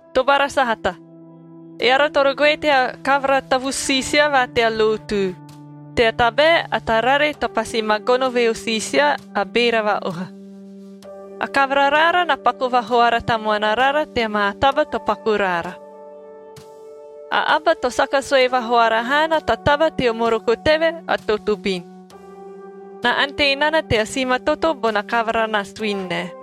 Tobara sahata, eara toro goe tea kavara tavusu siisia va tea lotu, tea tabae a tarare to pasi ma gono veo siisia a beera va-oha. A kavara raara na paku vahoara tamuana rara tea maa taba to paku raara. A aba to saka sue vahoara haana ta taba teo moroko teve, a totobin. Na ante nana tea simatoto bona kavara na suini nae.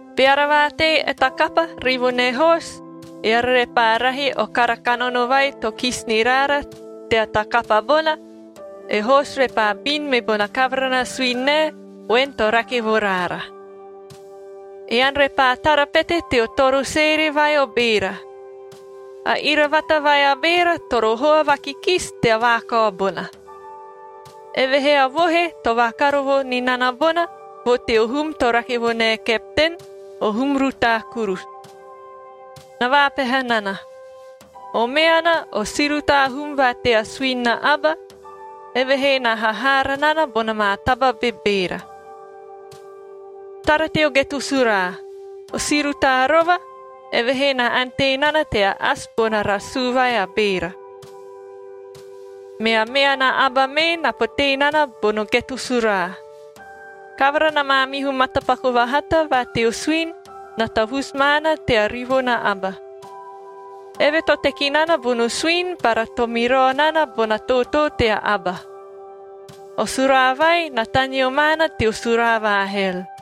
Beara vaatei e ta kapa rivo ne hoosu, eara repaa rahi o kara kanono vai to kisi ni raara tea ta kapa bona, e hoosu repaa bin me bona kavara na suini nae voen to rake vo raara. Ean repaa tara pete teo toro seere vai o beera. A iravata vai a beera toro hoa vakikisi tea vaakao bona. Evehee a vohe to vakarovo ni nana bonaa vo teo hum to rake vo nae kepten, o hum rutaa kurusu. Na vaapeha nana, o meanab o si rutaa hum va tea suini na aba, evehee na hahaara nana bona maa taba bebeera. Tara teo geto suraa, o si rutaa rova, evehee na ante nana tea asi bona rasuu vai a beera. Mea meana aba mee na potee nana bono geto suraa. Kavara na maamihu matapaku vahata va teo suini na tavusu maana tea rivo na aba. Eve to teki nana bono suini bara to mirao nana bona tootoo tea aba. O suraa vai na taneo maana teo suraa va hel.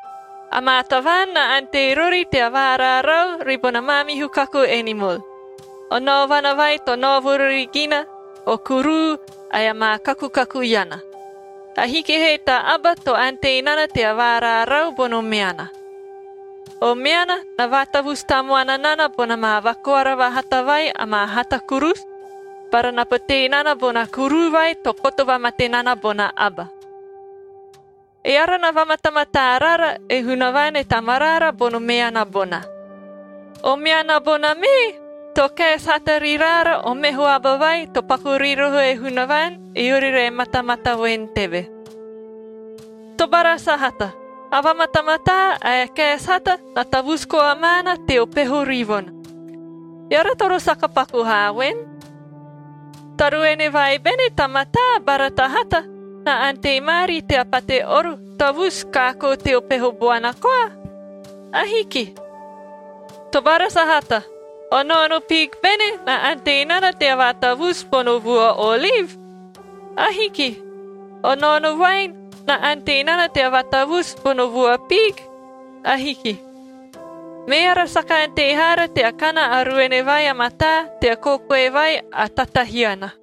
Amaa tavaan na ante rori tea vaaraarau ribona maamihu kaku enimol, o naovana vai to naovo rori gina, o kuruu ae amaa kakukaku iana. Ahiki he ta aba to ante nana tea vaaraaraau bono meana. O meana na vaatavusu tamuana nana bona maa vakoara vahata vai amaa hata kurusu bara na potee nana bona kuruu vai to koto vamate nana bona aba. Eara na vamatamataa rara e Hunavaan e Tamaraara bono meana bona. O meana bona mee to kaesi hata ri raara o meho aba vai to paku ri roho e Hunavaan, eori re matamata voen teve. Tobara sahata, a vamatamataa ae a kaesi hata na tavusu koa maana teo peho rivona. Eara toro saka paku haa voen. Ta ruene vai bene ta mataa bara ta hata na ante maari tea pate oro tavusu kaakoo teo peho boana koa? Ahiki. Tobara sahata, o naono piig bene na ante nana tea vaatavusu bono vua oliv? Ahiki. O naono voaen na ante nana tea vaatavusu bono vua piig? Ahiki. Meara saka ante haara tea kana a ruene vai a mataa tea kokoe vai a tatahiana.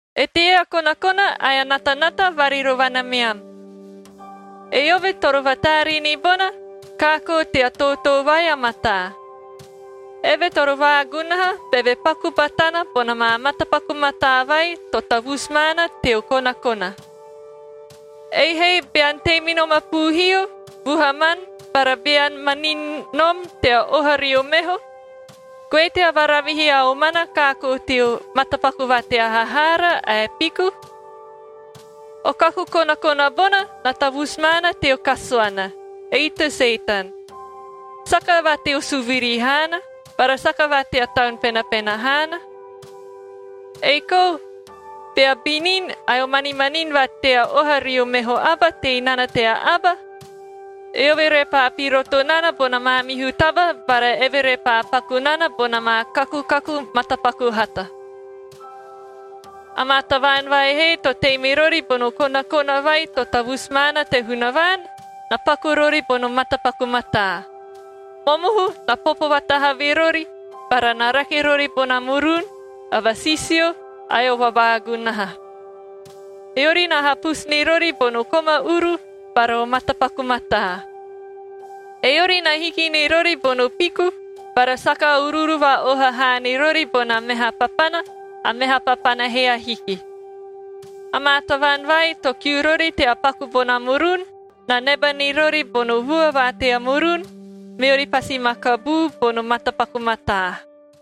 Eteie a konakona ae a natanata varirovana meam? Eove toro vataaree ni bona, kaakoo tea tootoo vai a mataa. Eve toro vaagunaha beve paku batana bona maa matapaku mataa vai to tavusu maana teo konakona. Ei he bean tei me nom a puuhio vuhaman bara bean manini nom tea oha rio meho, goe tea varavihi a omana kaakoo teo matapaku va tea hahaara ae piku. O kaku konakona bona na tavusu maana teo kasuana, ei te Setan. Saka va teo suviri haana bara saka va tea Taun Penapena haana. Ei kou bea binin ae o manimanin va tea oha rio meho aba tei nana tea aba, eove repaa piroto nana bona maamihu taba bara eve repaa paku nana bona maa kakukaku matapaku hata. Amaa tavaan vai he to tei me rori bono konakona vai to tavusu maana te Hunavaan na paku rori bono matapaku mataa. Momohu na popo vatahavi rori bara na rake rori bona murun, a vasisio, ae o vavaagunaha. Eori na hapusu ni rori bono koma uru bara o matapaku mataa. Eori na hiki ni rori bono piku bara saka uruuru va-oha haa ni rori bona meha papana, a meha papana he ahiki. Amaa tavaan vai to kiu rori tea paku bona murun, na neba ni rori bono vua va tea murun, meori pasi ma kabuu bono matapaku mataa.